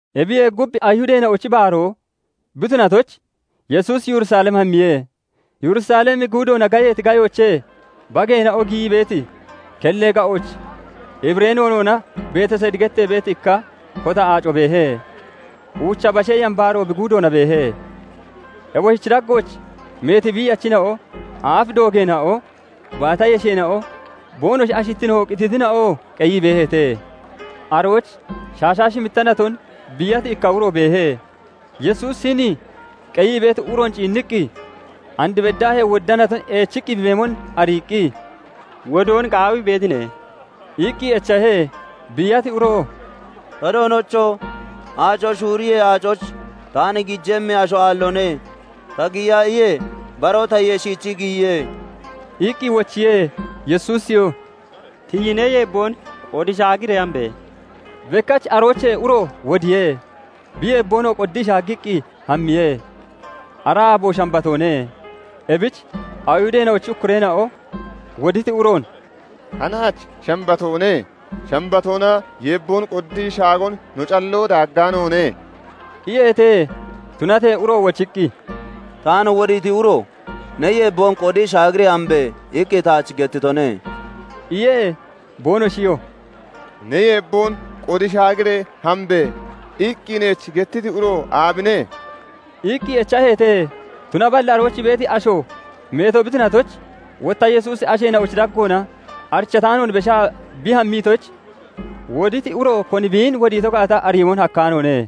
qEbiyee gub, Ayihudeena'ochi baaroo bi tunatoyich Yesuusi Yerusalem hammiye. Yerusalemi guudoona gayeeti gayoochee bageena'o giyii beeti kellee ga'ooch Hibiree noonoona Betesidi gettee beeti ikka kota aaco beehe; uucha bashee yambaaro bi guudoona beehe. Eboshichi daggooch meeti biiyachina'o, aaf doogeena'o, baata yesheena'o, boonoshi ashittino qititina'oo qeyii beeheete. Arooch shaashaa shimmitta naton biiyati ikka uro beehe. Yesuusi hini qeyii beeti uroon ciinniqqi, and beddaahee wodda naton eechiqqi bi beemon ariiqqi, "Wodoon qaawii beetine?" iqqi echahe. Biiyati uroo "Ta doonocho! Aaco shuuriyee, aacooch taan giijemmi asho aalloone; ta giya iyee, baroo tayee shiichii giyiye" iqqi wochiye. Yesuusiyoo "Tiyi ne yeebboon qodi shaagiree hambe!" iye. Bekkach aroochee uro wodiye; bi yeebboonoo qoddii shaaggiqqi hammiye. Ara aabo Shambatoone. Ebich Ayihudeena'ochi ukkureena'o woditi uroon "Hanaach Shambatoone; Shambatoona yeebboon qoddii shaagon no calloo daaggaanoone" iyeete. Tunatee uro wochiqqi, "Taan wodiiti uro 'Ne yeebboon qodi shaagiree hambe!' iqqi taach gettitone" iye. Boonoshiyoo " 'Ne yeebboon qodi shaagiree hambe!' iqqi neech gettiti uro aabine?" iqqi echaheete. Tunaballi arooch beeti asho meeto bi tunatoyich, wotta Yesuusi asheena'ochi daggoona arichataanoon beshaa bi hammitoyich, woditi uro koni biin wodiito gaata ariyoon hakkaanoone.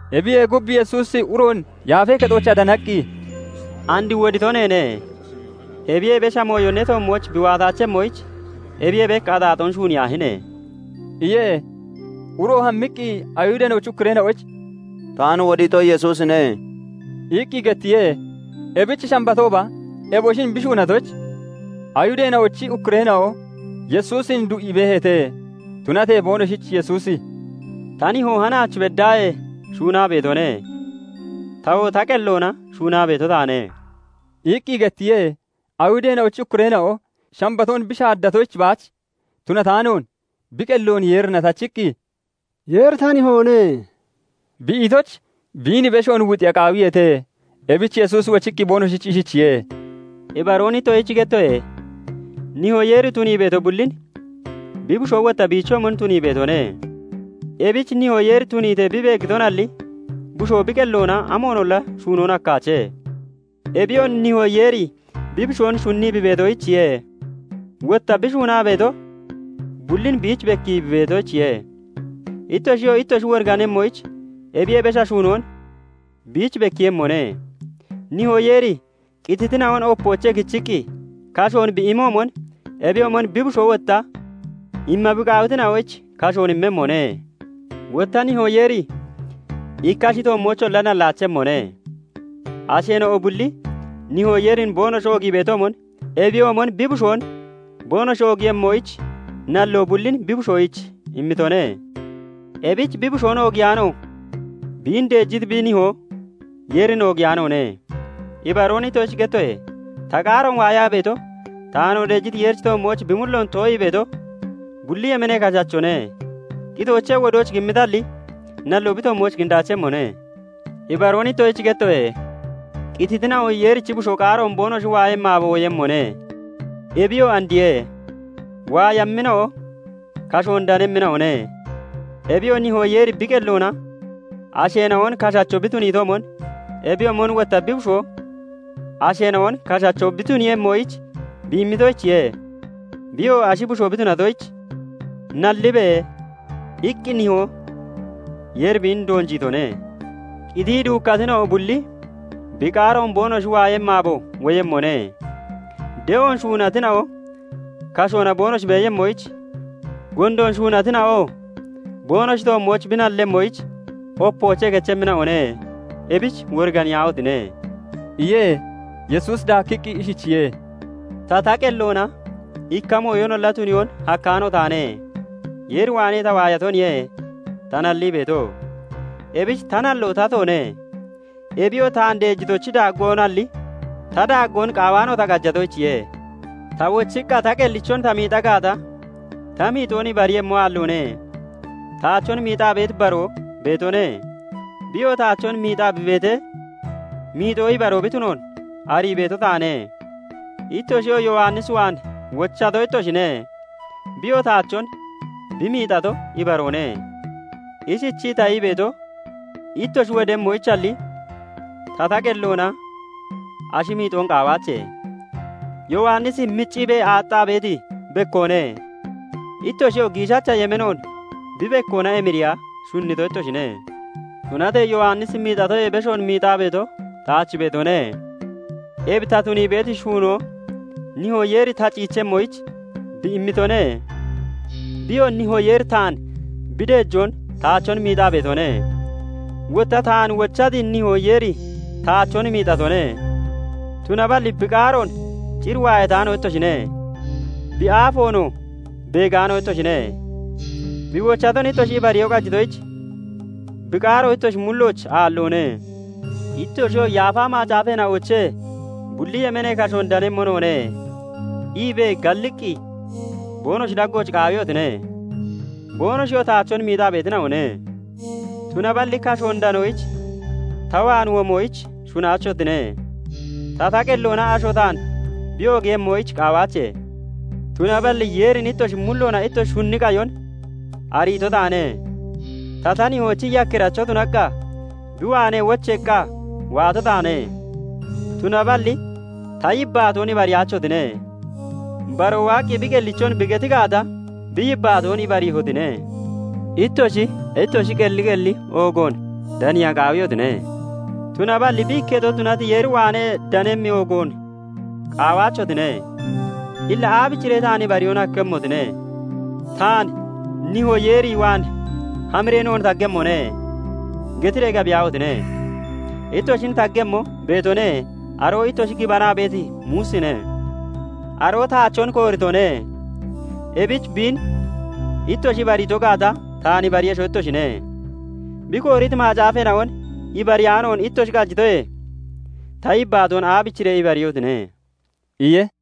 Ebiyee gub, Yesuusi uroon Yaafee Kexoochaa danaqqi, "And wodito neene; ebiyee besha mooyo ne toommooch bi waataachemmoyich, ebiyee bek axaaxoon shuuniyaahine!" iye. Uro hammiqqi Ayihudeena'ochi ukkureena'oyich "Taan wodiito Yesuusine" iqqi gettiye. Ebich Shambatooba eboshin bi shuunatoyich, Ayihudeena'ochi ukkureena'o Yesuusin du'ii beeheete. Tunatee boonoshich Yesuusi "Ta Nihoo hanaach beddaahee shuunaa beetone; tawoo ta qelloona shuunaa beeto taane" iqqi gettiye. Ayihudeena'ochi ukkureena'o Shambatoon bi shaaddatoyich baach tunataanoon, bi qelloon Yeerina tachiqqi, "Yeeri ta Nihoone" bi itoyich, biin beshoon wuxiya qaawiyeete. Ebich Yesuusi wochiqqi boonoshich ishichiye:- "Ibaroon ittoshich gettoye:- Nihoo Yeeri tunii beeto bullin bi Bushoo wotta biichoomon tunii beetone; ebich Nihoo Yeeri tuniitee bi beeggitonalli, Bushoo bi qelloona amoonolla shuunoon hakkaache. Ebiyoo Nihoo Yeeri bi Bushoon shunnii bi beetoyichiye; wotta bi shuunaa beeto bullin biich bekkii bi beetoyichiye; ittoshiyoo ittoshi woriganemmoyich ebiyee besha shuunoon biich bekkiiyemmone. Nihoo Yeeri qititina'on opoochee kichiqqi kashoon bi imoomon, ebiyoomon bi Bushoo wotta imma bi qaawitina'oyich kashoon immemmone. Wotta Nihoo Yeeri ikka ashi toommoocholla nallaachemmone; asheena'o bulli Nihoo Yeerin boonoshi oogii beetoomon ebiyoomon bi Bushoon boonoshi oogiiyemmoyich, nalloo bullin bi Bushoyich immitone; ebich bi Bushoon oogiyaano biin deejiti bi Nihoo Yeerin oogiyaanoone. "Ibaroon ittoshich gettoye:- Ta qaaroon waayaa beeto, taanoo deejiti Yeerichi toommooch bi mulloon too'ii beeto, bulli yemeenee kashachone; qitoochee wodooch kimmitalli, nalloo bi toommooch kindaachemmone. Ibaroon ittoshich gettoye:- Qititina'o Yeerichi Bushoo qaaroon boonoshi waayemmi aabo woyemmone; ebiyoo andiye; waayammina'o kashoon danemmina'one. Ebiyoo Nihoo Yeeri bi qelloona asheena'on kashacho bi tuniyoomon ebiyoomon wotta bi Bushoo asheena'on kashacho bi tuniiyemmoyich bi immitoyichiye. Biyoo Ashi Bushoo bi tunatoyich, 'Nallibe' iqqi Nihoo Yeeri biin doonjiitone. Qitii duukkatina'o bulli bi qaaroon boonoshi waayemmi aabo woyemmone; de'oon shuunatina'o kashoona boonoshi beeyemmoyich, gondoon shuunatina'oo boonoshi toommooch bi nalleeyemmoyich opoochee kechemmina'one. Ebich woriganiyaahotine!" iye. Yesuusi daakkiqqi ishichiye:- "Ta, ta qelloona ikka mooyonolla tuniyoon hakkaano taane; Yeer waanee ta waayatoniye ta nallii beeto; ebich ta nalloo tatoone; Ebiyoo taan deejitochi daaggoonalli, ta daaggoon qaawaano ta qajatoyichiye. "Ta wochiqqa ta qellichon ta miixa gaata, ta miixoon ibariiyemmo aalloone. Taachon miixaa beeti baroo beetone; biyoo taachon miixaa bi beeti miixo ibaroo bi tunoon arii beeto taane. "Ittoshiyoo Yowannis waan wochato ittoshine; biyoo taachon bi miixato ibaroone. Ishichii ta ii beeto, ittoshi wodemmoyichalli, ta, ta qelloona ashi miixoon qaawaache. Yowannisi micciibee aaxxaa beeti bekkoone; ittoshiyoo giishacha yemeenoon bi bekkoona emiriya shunnito ittoshine. "Tunatee Yowannisi miixatoyee beshoon miixaa beeto taach beetone. Ebi ta tunii beeti shuunoo Nihoo Yeeri ta ciichemmoyich bi immitone. Biyoo Nihoo Yeeri taan bi deejoon taachon miixaa beetone. Wotta taan wochati Nihoo Yeeri taachon miixatone; tunaballi bi qaaroon cir waayataano ittoshine; bi aafoonoo beegaano ittoshine. Bi wochaton ittoshi ibariyoo qajitoyich, bi qaaro ittoshi mullooch aalloone. Ittoshiyoo 'Yaafa Macaafeena'oochee bulli yemeenee kashoon danemmo noone' iibee, galliqqi boonoshi daggooch qaawiyotine; boonoshiyoo taachon miixaa beetina'one. Tunaballi kashoon danoyich ta waan womoyich shunnaachotine. "Ta, ta qelloona asho taan bi oogiiyemmoyich qaawaache. Tunaballi Yeerin ittoshi mulloona ittoshi shunni qayon ariito taane. Ta, ta Nihoochi yakkiracho tunaqqa bi waanee wocheeqqa waato taane; tunaballi ta yibbaatoon ibariyaachotine. Baroo waaqqi bi qellichon bi geti gaata, bi yibbaatoon ibariihotine. Ittoshi, ittoshi qelli qelli oogoon daniya qaawiyotine; tunaballi bi ikketo tunati Yeer waanee danemmi oogoon qaawaachotine. Illa aabichiree taan ibariyoon hakkemmotine? "Taan 'Nihoo Yeer waan hamiree noon taggemmone' getiree gabiyaahotine! Ittoshin taggemmo beetone; aroo ittoshi gibanaa beeti Muusine. Aroo taachon kooritone; ebich biin ittoshi ibariito gaata, taan ibariiyesho ittoshine. Bi kooriti Macaafeena'on ibariyaanoon ittoshi qajitoye, ta yibbaatoon aabichiree ibariiyehotine?" iye.